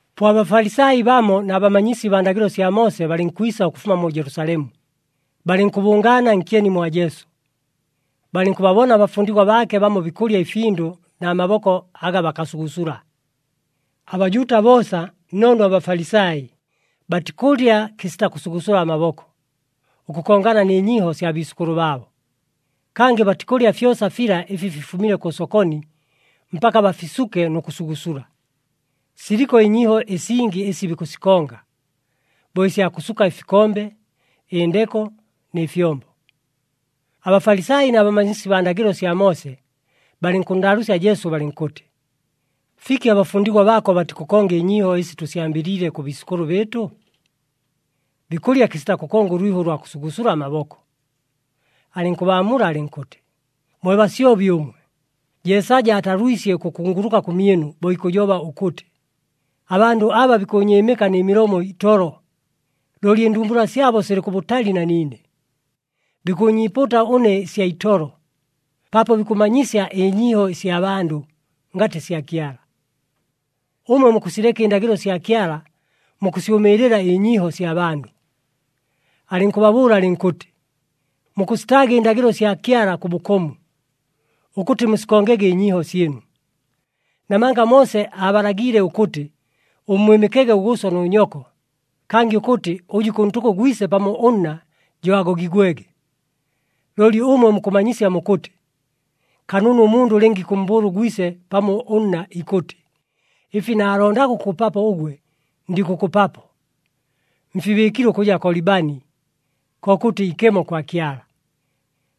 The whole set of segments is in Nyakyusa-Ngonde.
Po aBafalisai bamo na bamanyisi baa ndagɨlo sya Moose balɨnkwisa ʉkʉfuma mu Jelusalemu, balɨnkʉbʉngaana nkyeni mwa Jesu. Balɨnkʉbabona abafundigwa baake bamo bikʉlya ɨfindʉ na maboko aga bakasugusula. ABajuuta boosa nnoono aBafalisai, batikʉlya kɨsita kʉsugusula amaboko, ʉkʉkongana nɨ nyiiho sya biisʉkʉlʉ baabo. Kangɨ batikʉlya fyosa fila ɨfi fifumile kʉ sokoni mpaka bafisuke nʉ kʉsugusula. Siliko ɨnyiiho ɨsingi ɨsi bikʉsikonga, bo ɨsya kʉsuka ɨfikombe, ɨndeko nɨ fyombo. ABafalisai na bamanyisi baa ndagɨlo sya Moose balɨnkʉnndaalʉʉsya Jesu, balɨnkʉtɨ, “Fiki abafundigwa baako batikʉkonga ɨnyiiho ɨsi tʉsyambɨliile kʉ biisʉkʉlʉ bɨɨtʉ? Bikʉlya kɨsita kʉkonga ʉlwiho ʉlwa kʉsugusula amaboko.” Alɨnkʉbaamula alɨnkʉtɨ, “Mwe basyobi ʉmwe! Jeesaja aatalwisye ʉkʉkunguluka kʉmyɨnu, bo ikʉjoba ʉkʉtɨ, ‘Abandʉ aba, bikʉʉnyɨɨmɨka nɨ milomo itolo, looli ɨndumbula syabo silɨ kʉbʉtali na niine. Bikʉʉnyiipuuta ʉne ɨsya itolo, paapo bikʉmanyisya ɨnyiiho ɨsya bandʉ, ngatɨ sya Kyala.’ “Ʉmwe mukʉsileka ɨndagɨlo sya Kyala, mukʉsyʉmɨɨlɨla ɨnyiiho sya bandʉ.” Alɨnkʉbabʉʉla alɨnkʉtɨ, “Mukʉsitaaga ɨndagɨlo sya Kyala kʉ bʉkomu, ʉkʉtɨ musikongege ɨnyiiho syɨnu. Namanga Moose aabalagiile ʉkʉtɨ, ‘Ʉmmwɨmɨkege ʉgʉʉso nʉ nyoko,’ kangɨ ʉkʉtɨ, ‘Ʉjʉ ikʉntʉka ʉgwise pamo ʉnna, jo agogigwege.’ Looli ʉmwe mukʉmanyisya mukʉtɨ, ‘Kanunu ʉmundʉ lɨnga ikʉmmbʉʉla ʉgwise pamo ʉnna, ikʉtɨ, “Ɨfi naalondaga ʉkʉkʉpapo ʉgwe ndikʉkʉpapo, mfibɨɨkile ʉkʉja Kolibani, kokʉtɨ ikemo kwa Kyala.” ’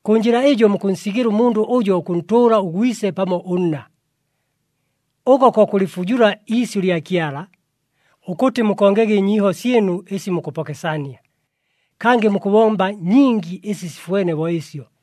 Kʉ njɨla ɨjo mukʉnsigɨla ʉmundʉ ʉjo ʉkʉntʉʉla ʉgwise pamo ʉnna. Ʉko ko kʉlɨfujula iisyʉ lya Kyala, ʉkʉtɨ mukongege ɨnyiiho syɨnu ɨsi mukʉpokesania. Kangɨ mukʉbomba nyingi ɨsi sifwene bo ɨsyo.”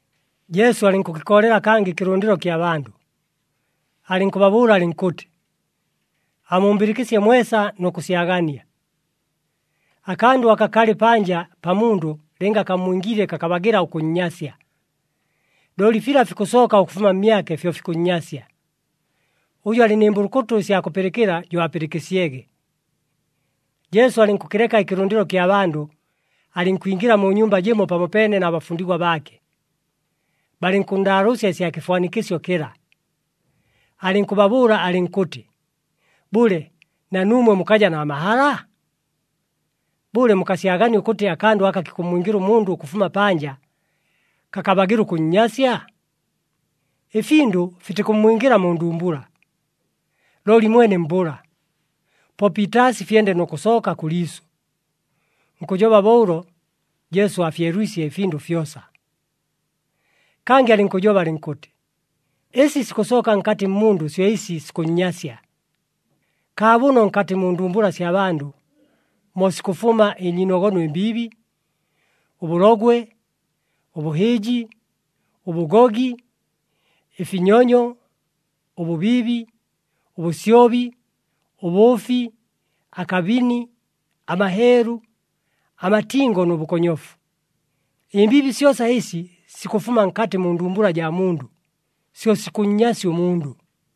Jesu alɨnkʉkɨkoolela kangɨ ɨkɨlʉndɨlo kya bandʉ, alɨnkʉbabʉʉla alɨnkʉtɨ, “Amumbɨlɨkɨsye mwesa, nʉ kʉsyagania! Akandʉ aka kalɨ panja pa mundʉ lɨnga kammwingiile kakabagɨla ʉkʉnnyasya. Looli fila fikʉsooka ʉkʉfuma mmyake, fyo fikʉnnyasya. [ Ʉjʉ alɨ nɨ mbʉlʉkʉtʉ ɨsya kʉpɨlɨkɨla, jo apɨlɨkɨsyege!]” Jesu alɨnkʉkɨleka ɨkɨlʉndɨlo kya bandʉ, alɨnkwingɨla mu nyumba jɨmo pamopeene na bafundigwa baake. Balɨnkʉnndaalʉʉsya ɨsya kɨfwanikɨsyo kɨla. Alɨnkʉbabʉʉla alɨnkʉtɨ, “Bʉle, na nuumwe mukaja na mahala? Bʉle, mukasyagania ʉkʉtɨ akandʉ aka kikʉmmwingɨla ʉmundʉ ʉkʉfuma panja, kakabagɨla ʉkʉnnyasya? Ɨfindʉ fitikʉmmwingɨla mu ndumbula, looli mwene mbʉla, po piitaasi fyende nʉ kʉsooka kʉ liisʉ.” (Nkʉjoba bo ʉlo, Jesu aafyelwisye ɨfindʉ fyosa.) Kangɨ alɨnkʉjoba alɨnkʉtɨ, “Ɨsi sikʉsooka nkatɨ mmundʉ syo ɨsi sikʉnnyasya. Kaabʉno nkatɨ mu ndumbula sya bandʉ mo sikʉfuma ɨnyiinogono ɨmbiibi, ʉbʉlogwe, ʉbʉhɨɨji, ʉbʉgogi, ɨfinyonyo, ʉbʉbiibi, ʉbʉsyobi, ʉbʉʉfi, akabini, amaheelu, amatingo nʉ bʉkonyofu. Ɨmbiibi syosa ɨsi sikʉfuma nkatɨ mu ndumbula jaa mundʉ, syo sikʉnnyasya ʉmundʉ.”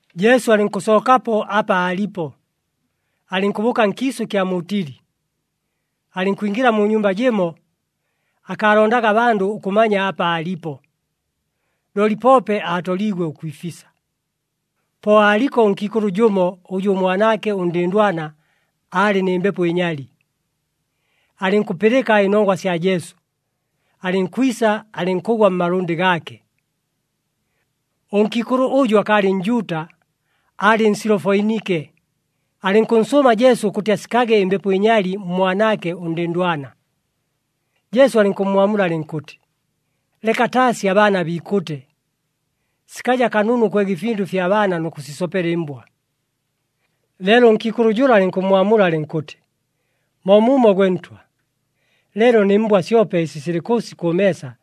Jesu alɨnkʉsookapo apa aalipo, alɨnkʉbʉʉka nkiisʉ ɨkya mu Tili. Alɨnkwingɨla mu nyumba jɨmo, akaalondaga abandʉ ʉkʉmanya apa aalipo, looli poope aatoliigwe ʉkwifisa. Po aaliko ʉnkiikʉlʉ jʉmo, ʉjʉ ʉmwanaake ʉndɨndwana aalɨ nɨ mbepo ɨnyali. Alɨnkʉpɨlɨka ɨnongwa sya Jesu, alɨnkwisa, alɨnkʉgwa mmalʉndɨ gaake. Ʉnkiikʉlʉ ʉjʉ akaalɨ Njuuta, aalɨ Nsilofoinike. Alɨnkʉnsʉʉma Jesu ʉkʉtɨ asikage ɨmbepo ɨnyali mmwanaake ʉndɨndwana. Jesu alɨnkʉmmwamula alɨnkʉtɨ, “Leka taasi abaana biikʉte. Sikaja kanunu ʉkwega ɨfindʉ ɨfya baana nʉ kʉsisopela ɨmbwa.” Leelo ʉnkiikʉlʉ jʉla alɨnkʉmmwamula alɨnkʉtɨ, “Moomuumo, gwe Ntwa, leelo nɨ mbwa syope ɨsi silɨ kʉʉsi kʉ meesa,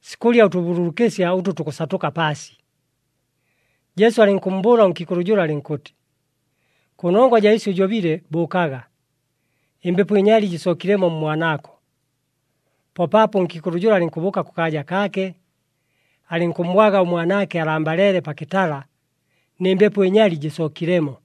sikʉlya ʉtʉbululukɨsya ʉtʉ tukʉsatʉka paasi.” Jesu alɨnkʉmmbʉʉla ʉnkiikʉlʉ jʉla, alɨnkʉtɨ, “Kʉnongwa jaa ɨsyo ʉjobile, bʉʉkaga, ɨmbepo ɨnyali jɨsookilemo mmwanaako.” Po paapo ʉnkiikʉlʉ jʉla alɨnkʉbʉʉka kʉkaaja kaake, alɨnkʉmmwaga ʉmwanaake alambaleele pa kɨtala nɨ mbepo ɨnyali jɨsookilemo.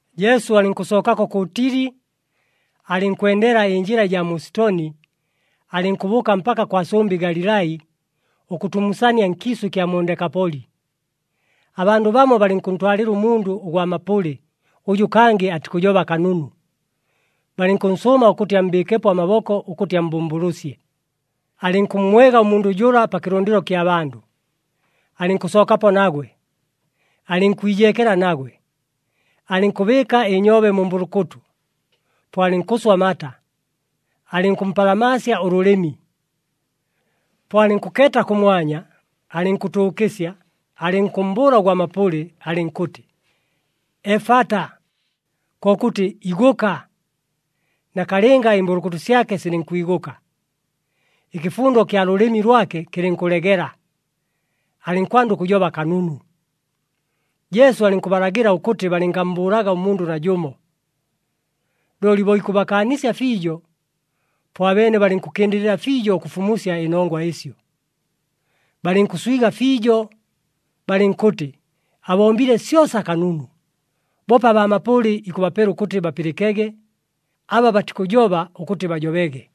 Jesu alɨnkʉsookako kʉ Tili, alɨnkwendela ɨnjɨla ɨjaa mu Sitoni, alɨnkʉbʉʉka mpaka kwa sʉmbɨ Galilai ʉkʉtumusania nkiisʉ ɨkya mu Ndekapoli. Abandʉ bamo balɨnkʉntwalɨla ʉmundʉ ʉgwa mapʉlɨ ʉjʉ kangɨ atikʉjoba kanunu, balɨnkʉnsʉʉma ʉkʉtɨ ammbɨɨkepo amaboko, ʉkʉtɨ ammbʉmbʉlʉsye. Alɨnkʉmmwega ʉmundʉ jʉla pa kɨlʉndɨlo kya bandʉ, alɨnkʉnsookapo nagwe, alɨnkwijeekela nagwe. Alɨnkʉbɨɨka ɨnyoobe mu mbʉlʉkʉtʉ, po alɨnkʉswa amata, alɨnkʉmpalamaasya ʉlʉlɨmi. Po alɨnkʉkeeta kʉmwanya, alɨnkʉtʉʉkɨsya, alɨnkʉmmbʉʉla ʉgwa mapʉlɨ, alɨnkʉtɨ, “Efata!” Kokʉtɨ, “Igʉka!” Nakalɨnga ɨmbʉlʉkʉtʉ syake silɨnkwigʉka, ɨkɨfundo kya lʉlɨmi lwake kɨlɨnkʉlegela, alɨnkwanda ʉkʉjoba kanunu. Jesu alɨnkʉbalagɨla ʉkʉtɨ balɨngammbʉʉlaga ʉmundʉ najʉmo. Looli bo ikʉbakaanisya fiijo, po abeene balɨnkʉkɨndɨlɨla fiijo ʉkʉfumusya ɨnongwa ɨsyo. Balɨnkʉswiga fiijo, balɨnkʉtɨ, “Abombile syosa kanunu! Boope abaa mapʉlɨ ikʉbapela ʉkʉtɨ bapɨlɨkege, aba batikʉjoba ʉkʉtɨ bajobege.”